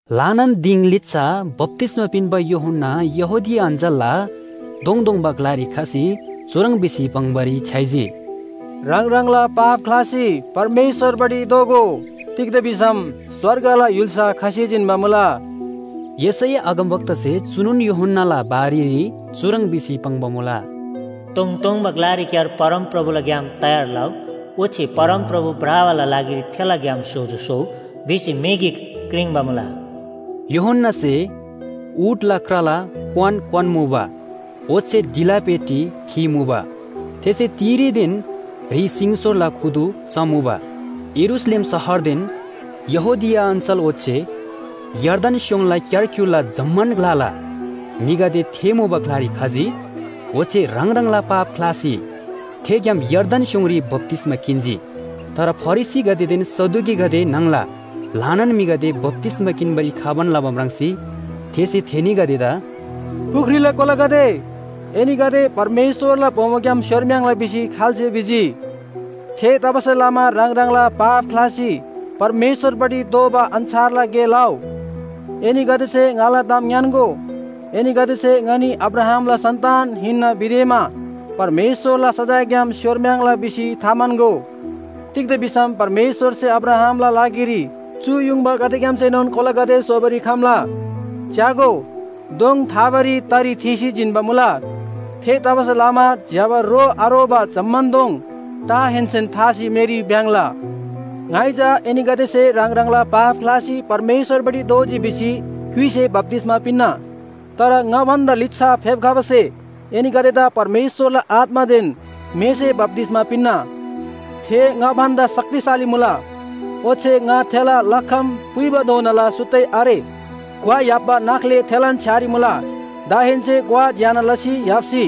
ल्‍हानान दिङ लिच्‍छा बप्‍तिस्‍मा पिन्‍बा यूहन्‍ना यहूदिया अञ्‍चलला तोङतोङबा ग्‍लारी खसी चुह्रङ् भिसी पाङ्‌बारी छ्‌याइजी, “ह्राङ ह्राङला पाप ख्‍लासी परमेश्‍वरपट्टि दोःगो, तिग्‍दा भिसम स्‍वर्गला य्‍हुल्‍सा खसी जिन्‍बा मुला।” यशैया अगमवक्तासे चुनोन यूहन्‍नाला बारेरी चुह्रङ् भिसी पाङ्बा मुला, “तोङतोङबा ग्‍लारीक्‍यार परमप्रभुला ग्‍याम तयार लउ, ओच्‍छे ‘परमप्रभु भ्रबाला लागिरी थेला ग्‍याम सोजो स्‍होउ,’ भिसी म्‍हि गिक क्रिङ्बा मुला।” यूहन्‍नासे ऊँटला क्राला क्‍वान क्‍वान्‍मुबा, ओच्‍छे ढिला पेटी खीमुबा। थेसे तिरीदेन ह्रि सिङसोरला खुदु चमुबा। यरूशलेम शहरदेन यहूदिया अञ्‍चल ओच्‍छे यर्दन स्‍योङला क्‍यारक्‍युरला जम्‍मान ग्‍लाला म्‍हिगदे थे मुबा ग्‍लारी खजी। ओच्‍छे ह्राङ ह्राङला पाप ख्‍लासी थेग्‍याम यर्दन स्‍योङरी बप्‍तिस्‍मा किन्‍जी। तर फरिसीगदेदेन सदुकीगदे न्‍हङला ल्‍हानान म्‍हिगदे बप्‍तिस्‍मा किन्‍बारी खबान लबा म्राङ्सी थेसे थेनीगदेदा “पुख्रीला कोलागदे, एनीगदेदा परमेश्‍वरला बोमोग्‍याम स्‍योरम्‍याङ्ला भिसी खाल्‍से भिजी? थेतबासेलमा ह्राङ ह्राङला पाप ख्‍लासी परमेश्‍वरपट्टि दोःबा अन्‍छारला गे लउ। एनीगदेसे ङाला ताम ङ्‌यान्‍गो, एनीगदेसे ‘ङनी अब्राहामला सन्‍तान हिन्‍ना’ भिदेमा परमेश्‍वरला सजायग्‍याम स्‍योरम्‍याङ्ला भिसी थाम्‍हन्‍गो। तिग्‍दा भिसम परमेश्‍वरसे अब्राहामला लागिरी चु युङबागदेग्‍यामसेनोन कोलागदे स्‍होबारी खम्‍ला। च्‍यागो, दोङ थाबारी तरी थीसी जिन्‍बा मुला। थेतबासेलमा ज्‍यबा रो आरोबा जम्‍मान दोङ टाहेन्‍सेन थासी मेरी भ्‍याङ्‍ला। “ङाइ चा एनीगदेसे ह्राङ ह्राङला पाप ख्‍लासी परमेश्‍वरपट्टि दोःजी भिसी क्‍युइसे बप्‍तिस्‍मा पिन्‍ना। तर ङा भन्‍दा लिच्‍छा फेप्‍खबासे एनीगदेदा परमेश्‍वरला आत्‍मादेन मेसे बप्‍तिस्‍मा पिन्‍ना। थे ङा भन्‍दा शक्तिशाली मुला। ओच्‍छे ङा थेला लखम पुइबाधोनाला सुत्तै आरे। ग्‍वा य्‍हाप्‍बा नाख्‍ले थेलान छ्‌यारी मुला, दाहेन्‍से ग्‍वा ज्‍यना लसी य्‍हाप्‍सी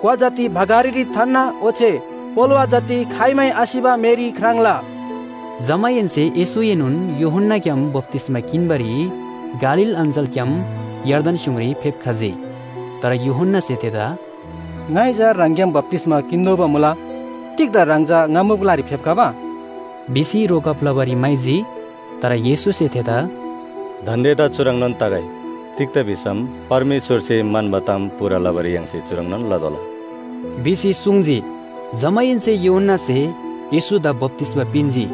ग्‍वा जति भकारीरी थान्‍ना ओच्‍छे पोलोवा जति खाइमै आसिबा मेरी ख्राङ्ला।” जमाहेन्‍से येशूएनोन यूहन्‍ना ग्‍याम बप्‍तिस्‍मा किन्‍बारी गालील अञ्‍चलग्‍याम यर्दन स्‍योङरी फेप्‍खजी। तर यूहन्‍नासे थेदा “ङाइ चा ह्राङग्‍याम बप्‍तिस्‍मा किन्‍तोःबा मुला, तिग्‍दा ह्राङ चा ङा मुबा ग्‍लारी फेप्‍खबा?” भिसी रोकब लबारी म्‍हाइजी। तर येशूसे थेदा “दान्‍देदा चुह्रङ्‌नोन तगै। तिग्‍दा भिसम परमेश्‍वरसे म्‍हन्‍बा ताम पूरा लबारी य्‍हाङसे चुह्रङ्‌नोन लतोःला” भिसी सुङ्जी। जमाहेन्‍से यूहन्‍नासे येशूदा बप्‍तिस्‍मा पिन्‍जी।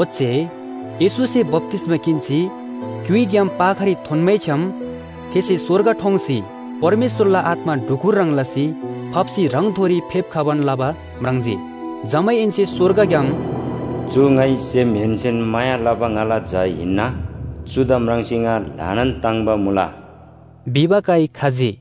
ओच्‍छे येशूसे बप्‍तिस्‍मा किन्‍सी क्‍युइग्‍याम पाखारी थोन्‍मैछ्‌याम थेसे स्‍वर्ग ठोङ्सी परमेश्‍वरला आत्‍मा ढुकुर ह्रङ् लसी फाप्‍सी ह्राङथोरी फेप्‍खबान लबा म्राङ्जी। जमाहेन्‍से स्‍वर्गग्‍याम “चु ङाइ सेमहेन्‍सेन माया लबा ङाला झा हिन्‍ना, चुदा म्राङ्सी ङा ल्‍हानान ताङ्‍बा मुला” भिबा काइ खजी।